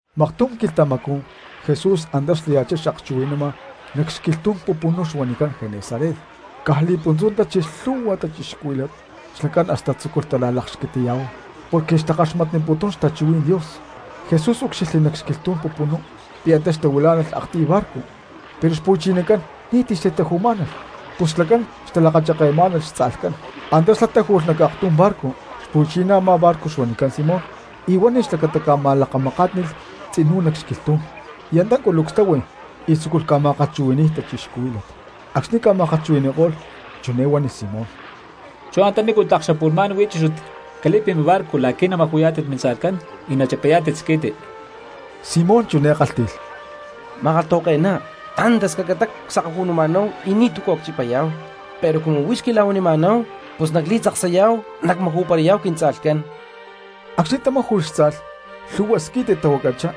Maktum quilhtamacú Jesús antá xlaya̠chá xakchuhui̠nama nac xquilhtú̠n pupunú huanicán Genesaret, caj li̠puntzú tachilh lhu̠hua cristianos xlacán hasta tzúculh talakxquitiya̠huay porque xtakaxmatputún xtachuhuí̠n Dios. Jesús úcxilhli nac xquilhtú̠n pupunú pi̠ antá xtahuilá̠nalh aktiy barco pero xpu̠chinacán ni̠ti̠ xtataju̠má̠nalh, pus xlacán xtalakacheke̠má̠nalh xtza̠lhcán. Antá xlá táju̠lh nac aktum barco, xpu̠chiná a̠má barco xuanicán Simón y huánilh xlacata cama̠lakamakátli̠lh tzinú nac xquilhtú̠n. Y antá culucs táhui y tzúculh ca̠ma̠kalhchuhui̠ni̠y cristianos. Acxni̠ ca̠ma̠kalhchuhui̠ni̠ko̠lh chiné huánilh Simón: —Chú antanícu tlak xapu̠lhmá̠n huí chúchut cali̠pi mibarco la̠qui̠ namaju̠yá̠tit mintza̠lhcán y nachipayá̠tit squi̠ti. Simón chiné kálhti̠lh: —Ma̠kalhtahuake̠ná, tantascacatá csakaju̠numa̠náhu y ni̠tu̠cu a̠ cchipayá̠hu; pero cumu huix quila̠huanima̠náhu pus nacli̠tzaksayá̠hu nacmaju̠parayá̠hu quintza̠lhcán. Acxni̠ tamáju̠lh tza̠lh, lhu̠hua squi̠ti tahuacachá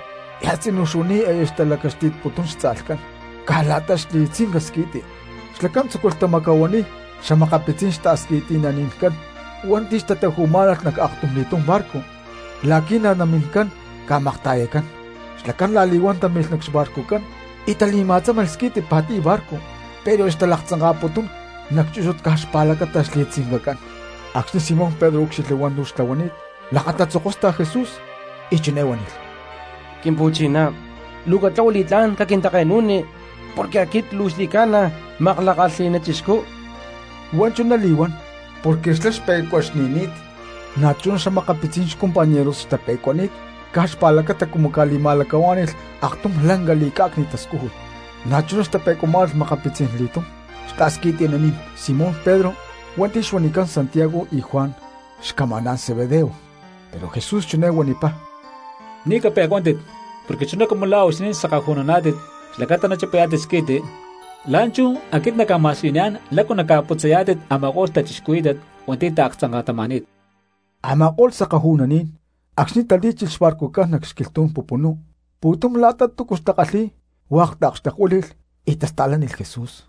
y a̠tzinú xuani̠t aya xtalacaxti̠tputún xtza̠lhcán caj la̠ta xli̠tzinca squi̠ti. Xlacán tzúculh tamacahuaniy xa̠makapitzí̠n xta̠squi̠ti̠nani̠ncán hua̠nti̠ xtataju̠má̠nalh nac aktumli̠tum barco la̠qui̠ namincán ca̠makta̠yacán. Xlacán la̠li̠huán talí̠milh xbarcucán y tali̠ma̠tzámalh squi̠ti pa̠tiy barco, pero aya xtalaktzanka̠putún nac chúchut caj la̠ta xli̠tzincacán. Acxni̠ Simón Pedro úcxilhli hua̠ntu̠ xtlahuani̠t lakatatzokóstalh Jesús y chiné huánilh: —Quimpu̠chiná, luu catlahua li̠tlá̠n capit porque aquit luu xli̠ca̠na makla̠kalhi̠ná chixcú. Huá chuná li̠huán porque xlá xpe̠cuaxni̠ni̠t na̠chuná xa̠makapitzí̠n xcompañeros xtape̠cuani̠t caj xpa̠lacata cumu ca̠li̠ma̠lacahuá̠ni̠lh aktum lanca li̠cá̠cni̠t tascújut. Na̠chuná xtape̠cuamá̠nalh makapitzí̠n li̠tum xta̠squi̠ti̠naní̠n Simón Pedro hua̠nti̠ xca̠huanicán Santiago y Juan xcamaná̠n Zebedeo, pero Jesús chiné huanipá: —Ni̠ cape̠cuántit porque chuná cumu huixinín sakaju̠nuná̠tit xlacata nachipayá̠tit squi̠ti, la̠nchú aquit nacca̠ma̠siyuniyá̠n lácu naca̠putzayá̠tit a̠ma̠ko̠lh cristianos hua̠nti̠ taaktzanka̠tama̠ni̠t. Amako̠lh sakaju̠nuní̠n acxni̠ talí̠chilh xbarcucán nac xquilhtú̠n pupunú pu̠tum la̠ta túcu xtakalhi̠y hua̠k taakxtekhuíli̠lh y tasta̠lánilh Jesús.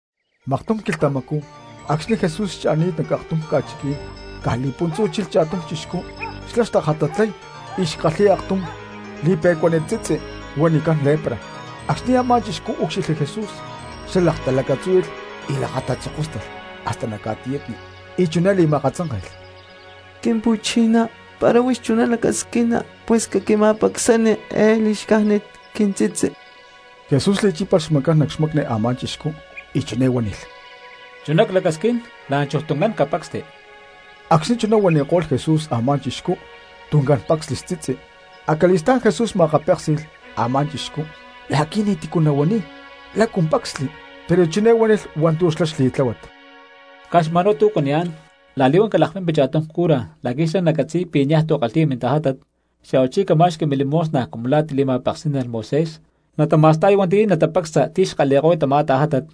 Maktum quilhtamacú acxni̠ Jesús xcha̠ni̠t nac aktum ca̠chiquí̠n caj li̠puntzú chilh cha̠tum chixcú xlá xtajatatlay y xkalhi̠y aktum li̠pe̠cuánit tzitzi huanicán lepra. Acxni̠ a̠má chixcú úcxilhli Jesús xlá laktalacatzúhui̠lh y lakatatzokóstalh hasta nac ca̠tiyatni, y chiné li̠ma̠akatzánke̠lh: —Quimpu̠chiná, para huix chuná lacasquina pus caquima̠pacsani eé li̠xcájnit quintzitzi. Jesús li̠chípalh xmacán nac xmacni a̠má chixcú y chiné huánilh: —Chuná clacasquín, la̠nchuj tuncán capacsti. Acxni̠ chuná huanko̠lh Jesús, a̠má chixcú tuncán pácsnilh xtzitzi. Acali̠stá̠n Jesús ma̠akapéksi̠lh a̠má chixcú la̠qui̠ ni̠ti̠cu nahuaniy lácu pacsli, pero chiné huánilh hua̠ntu̠ xlá xli̠tláhuat: —Caj xma̠nhuá tu̠ cuaniyá̠n, la̠li̠huán calakpimpi cha̠tum cura la̠qui̠ xlá nacatzi̠y pi̠ niaj tu̠ kalhi̠yá̠n mintajátat, xa̠huachí cama̠xqui milimosna cumu la̠ tili̠ma̠peksí̠nalh Moisés natama̠sta̠y hua̠nti̠ natapacsa ti̠ xkalhi̠ko̠y tamá tajátat,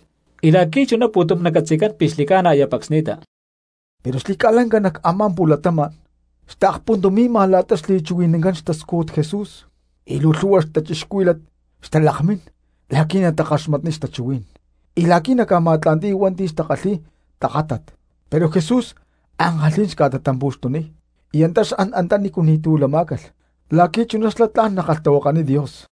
y la̠qui̠ chuná pu̠tum nacatzi̠cán pi̠ xli̠ca̠na aya pacsni̠ta. Pero xli̠ca̠lanca nac a̠má pu̠latama̠n xtaakpuntumi̠ma la̠ta xli̠chuhui̠nancán xtascújut Jesús, y luu lhu̠hua cristianos xtalakmín la̠qui̠ natakaxmatniy xtachuhuí̠n y la̠qui̠ naca̠ma̠tla̠nti̠y hua̠nti̠ xca̠kalhi̠y tajátat. Pero Jesús ankalhí̠n xca̠tatampu̠xtuniy y antá xan antanícu ni̠ti̠ lama cristianos la̠qui̠ chuná xlá tla̠n nakalhtahuakaniy Dios.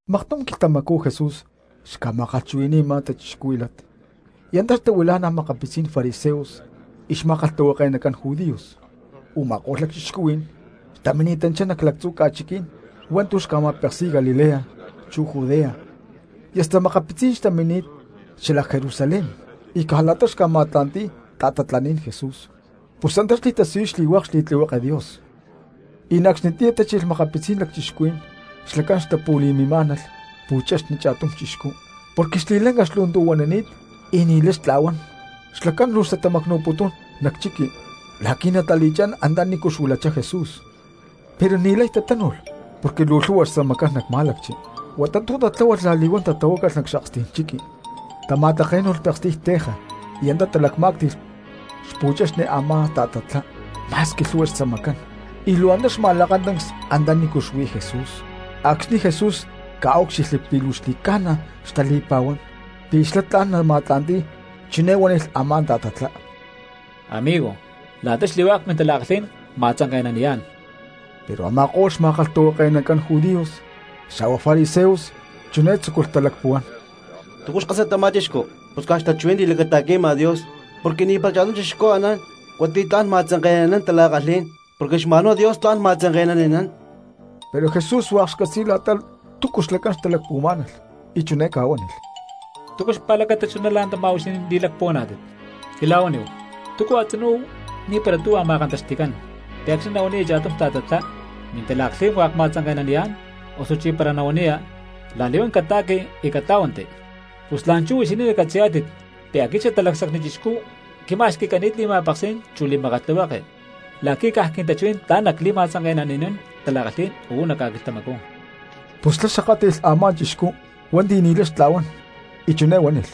Maktum quilhtamacú Jesús xca̠ma̠kalhchuhui̠ni̠ma cristianos y na̠ antá xtahuila̠na makapitzí̠n fariseos chu xma̠kalhtahuake̠nacán judíos, u̠ma̠ko̠lh lacchixcuhuí̠n xtamini̠tanchá nac lactzu̠ ca̠chiquí̠n hua̠ntu̠ xca̠ma̠peksi̠y Galilea chu Judea y hasta makapitzí̠n xtamini̠t xalac Jerusalén. Y caj la̠ta xca̠ma̠tla̠nti̠y ta̠tatlaní̠n Jesús pus antá xli̠tasiyuy xli̠hua̠k xli̠makatlihueke Dios. Y na̠ acxnitiyá tachilh makapitzí̠n lacchixcuhuí̠n xlacán xtapu̠le̠má̠nalh pu̠chexni cha̠tum chixcú porque xli̠lanca xlu̠ntu̠huanani̠t y ni̠lay xtla̠huán. Xlacán luu xtatamacnu̠putún nac chiqui la̠qui̠ natali̠chá̠n antanícu xuilachá Jesús. Pero xlacán ni̠lay tatánu̠lh porque luu lhu̠hua xtzamacán nac má̠lacchi, huata tu̠ tatláhualh la̠li̠huán tatahuácalh nac xakstí̠n chiqui, tama̠také̠nu̠lh pekstiy teja y antá talacmá̠cti̠lh xpu̠chexni a̠má ta̠tatlá ma̠squi lhu̠hua xtzamacán, y luu antá xma̠lakatancs antanícu xuí Jesús. Acxni̠ Jesús ca̠úcxilhli pi̠ luu xli̠ca̠na xtali̠pa̠huán pi̠ xlá tla̠n nama̠tla̠nti̠y, chiné huánilh a̠má ta̠tatlá: —¡Amigo, la̠ta xli̠hua̠k mintala̠kalhí̠n cma̠tzanke̠naniyá̠n! Pero a̠ma̠ko̠lh xma̠kalhtahuake̠nacán judíos xa̠hua fariseos chiné tzúculh talacpuhuán: “¿Túcu xkásat tamá chixcú? Pus caj xtachuhuí̠n li̠lacata̠qui̠ma Dios, porque ni̠para cha̠tum cristiano anán hua̠nti̠ tla̠n nama̠tzanke̠nani̠nán tala̠kalhí̠n, porque xma̠nhuá Dios tla̠n nama̠tzanke̠nani̠nán.” Pero Jesús hua̠k xcatzi̠y la̠ta túcu xlacán xtalacpuhuamá̠nalh, y chiné ca̠huánilh: —¿Túcu xpa̠lacata chuná la̠ntamá huixinín li̠lacpuhuaná̠tit? Quila̠huaníhu, ¿túcu a̠tzinú ni̠para tuhua ma̠kantaxti̠cán, pi̠ acxni̠ nahuaniya cha̠tum ta̠tatlá: “Mintala̠kalhí̠n hua̠k cma̠tzanke̠naniyá̠n”, osuchí para nahuaniya: “La̠li̠huán cata̠qui, y catlá̠huanti”? Pus la̠nchú huixinín nacatzi̠yá̠tit pi̠ aquit Xatalacsacni Chixcú y quima̠xqui̠cani̠t li̠ma̠peksí̠n chu li̠makatlihueke la̠qui̠ caj quintachuhuí̠n tla̠n nacli̠ma̠tzanke̠nani̠nán tala̠kalhí̠n uú nac ca̠quilhtamacú. Pus xlá xakátli̠lh a̠má chixcú hua̠nti̠ ni̠lay xtla̠huán y chiné huánilh: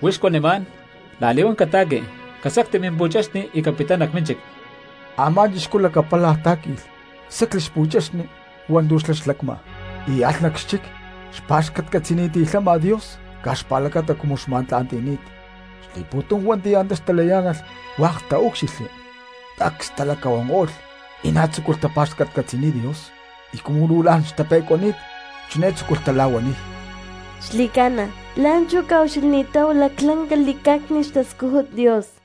—Huix cuanimá̠n, la̠li̠huán cata̠qui, casacti mimpu̠chexni y capittá nac mínchic. Amá chixcú lacapálaj tá̠qui̠lh, sacli xpu̠chexni hua̠ntu̠ xlá xlacma, y alh nac xchic xpa̠xcatcatzi̠niti̠lhama Dios caj xpa̠lacata cumu xma̠tla̠nti̠ni̠t, li̠pu̠tum hua̠nti̠ antá xtayá̠nalh hua̠k taúcxilhli. Cacs talacahuanko̠lh y na̠ tzúculh tapa̠xcatcatzi̠niy Dios, y cumu luu la̠n xtape̠cuani̠t chiné tzúculh tala̠huaniy: —Xli̠ca̠na la̠nchú ca̠ucxilhni̠táhu laclanca li̠cá̠cni̠t xtascújut Dios.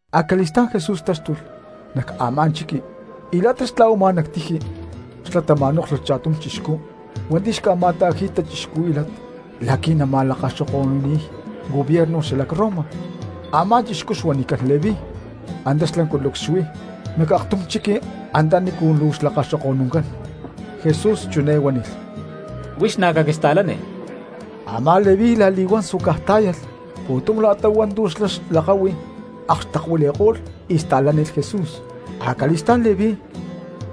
Acali̠stá̠n Jesús táxtulh nac a̠má chiqui, y la̠ta xtla̠huama nac tiji xlá ma̠nóklhulh cha̠tum chixcú hua̠nti̠ xca̠ma̠ta̠ji̠y cristianos la̠qui̠ natalakaxoko̠nuniy gobierno xalac Roma. Amá chixcú xuanicán Leví, antá xlá culucs xuí nac aktum chiqui antanícu luu xlakaxoko̠nuncán. Jesús chiné huánilh: —Huix na̠ caquista̠lani. Amá Leví la̠li̠huán suacaj tá̠yalh, pu̠tum la̠ta hua̠ntu̠ xlá xlakáhui akxtekuili̠ko̠lh y sta̠lánilh Jesús. Acali̠stá̠n Leví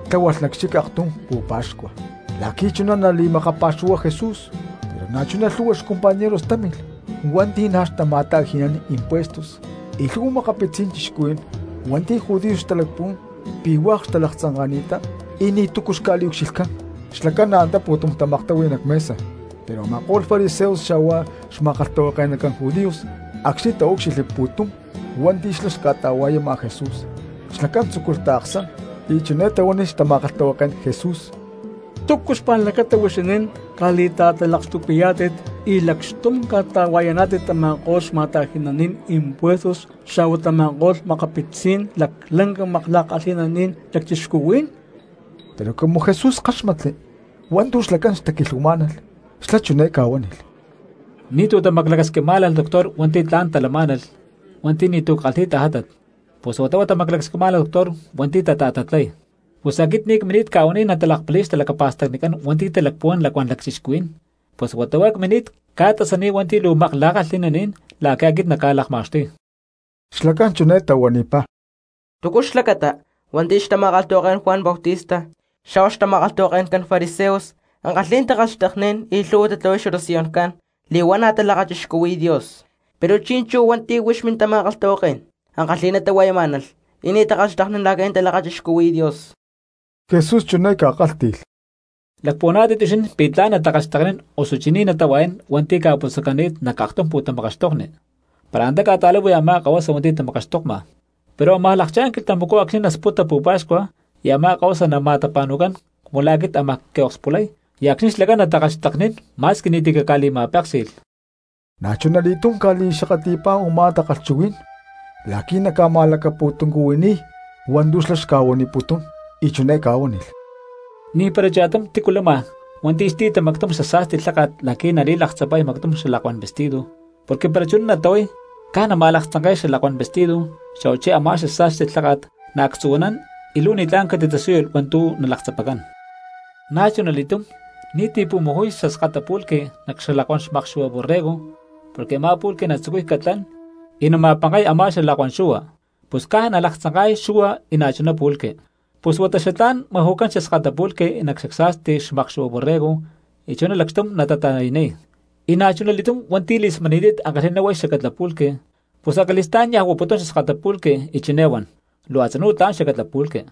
tláhualh nac xchic aktum pu̠pa̠xcua la̠qui̠ chuná nali̠makapa̠xuhuay Jesús, pero na̠chuná lhu̠hua xcompañeros támilh hua̠nti̠ na̠ xtama̠ta̠ji̠y cristianos natalakaxoko̠nún, y lhu̠hua makapitzí̠n cristianos hua̠nti̠ judíos xtalacpuhuán pi̠ hua̠k xtalaktzanka̠ni̠ttá y ni̠tu̠cu xca̠liucxilhcán, xlacán na̠ antá pu̠tum tamaktahui nac mesa. Pero a̠ma̠ko̠lh fariseos xa̠hua xma̠kalhtahuake̠nacán judíos acxni̠ taúcxilhli pu̠tum hua̠nti̠ xlá xca̠ta̠hua̠yama Jesús xlacán tzúculh taaksán y chiné tahuánilh xtama̠kalhtahuaké̠n Jesús: —¿Túcu xpa̠lacata huixinín ca̠li̠ta̠talakxtupi̠yá̠tit y lacxtum ca̠ta̠hua̠yaná̠tit tama̠ko̠lh xma̠ta̠ji̠naní̠n impuestos xa̠hua tama̠ko̠lh makapitzí̠n laclanca makla̠kalhi̠naní̠n lacchixcuhuí̠n? Pero cumu Jesús káxmatli hua̠ntu̠ xlacán xtaquilhuamá̠nalh xlá chiné ca̠kálhti̠lh: —Ni̠tu̠ tamaclacasquimá̠nalh doctor hua̠nti̠ tla̠n talamá̠nalh hua̠nti̠ ni̠tu̠ kalhi̠y tajátat, pus huata huá tamaclacasquín doctor hua̠nti̠ tata̠tatlay. Pus aquit ni̠ cmini̠t ca̠huaniy natalakpali̠y xtalacapa̠stacnicán hua̠nti̠ talacpuhuán lacuán cristianos, pus huata huá cmini̠t ca̠tasaniy hua̠nti̠ luu makla̠kalhi̠naní̠n la̠qui̠ aquit nacca̠lakma̠xtuy. Xlacán chiné tahuanipá: —¿Túcu xlacata hua̠nti̠ xtama̠kalhtahuaké̠n Juan Bautista xa̠hua xtama̠kalhtahuake̠ncán fariseos ankalhí̠n takalhxteknín y lhu̠hua tatlahuay xoración li̠huaná̠ natalakachixcuhui̠y Dios, pero chi̠nchú hua̠nti̠ huix mintama̠kalhtahuaké̠n ankalhi̠ná tahua̠yamá̠nalh y ni̠ takalhxteknín la̠qui̠ natalakachixcuhui̠y Dios? Jesús chiné ca̠kálhti̠lh: —¿Lacpuhuaná̠tit huixinín pi̠ tla̠n natakalhxteknín osuchí ni̠ natahua̠yán hua̠nti̠ ca̠putzacani̠t nac aktum pu̠tamakaxtokni, para antá ca̠ta̠láhui a̠má kahuasa hua̠nti̠ tamakaxtokma? Pero ámaj lakchá̠n quilhtamacú acxni̠ nasputa pu̠pa̠xcua y a̠má kahuasa nama̠tapa̠nu̠cán cumu la̠ aquit ámaj quiokspulay y acxni̠ xlacán natakalhxteknín ma̠squi ni̠ti̠ caca̠li̠ma̠péksi̠lh. Na̠chunali̠túm ca̠li̠xakatli̠pá u̠má takalhchuhuí̠n la̠qui̠ naca̠li̠ma̠lacapu̠tuncuhui̠niy hua̠ntu̠ xlá xca̠huaniputún, y chiné ca̠huánilh: —Ni̠para cha̠tum cristiano lama hua̠nti̠ xti̠ta mactum xasa̠sti lháka̠t la̠qui̠ nali̠laktzapay mactum xalakuán vestido, porque para chuná natlahuay caj nama̠laktzanke̠y xalakuán vestido, xa̠huachí a̠má xasa̠sti lháka̠t naactzu̠huanán y luu ni̠tlá̠n catitasíyulh hua̠ntu̠ nalaktzapacán. Na̠chunali̠túm ni̠ti̠ pu̠maju̠y xaskata pulque nac xalakuán xmakxu̠hua borrego, porque a̠má pulque natzucuy catlán y nama̠pankay a̠má xalakuán xu̠hua, pus caj nalaktzanka̠y xu̠hua y na̠chuná pulque. Pus huata xatlá̠n maju̠cán xaskata pulque nac xasa̠sti xmakxu̠hua borrego y chuná lacxtum natata̠yaniy. Y na̠chuna li̠túm hua̠nti̠ li̠smani̠ni̠t ankalhi̠ná huay xacatla pulque pus acali̠stá̠n niaj huaputún xaskata pulque, y chiné huan: “Luu a̠tzinú tla̠n xacatla pulque.”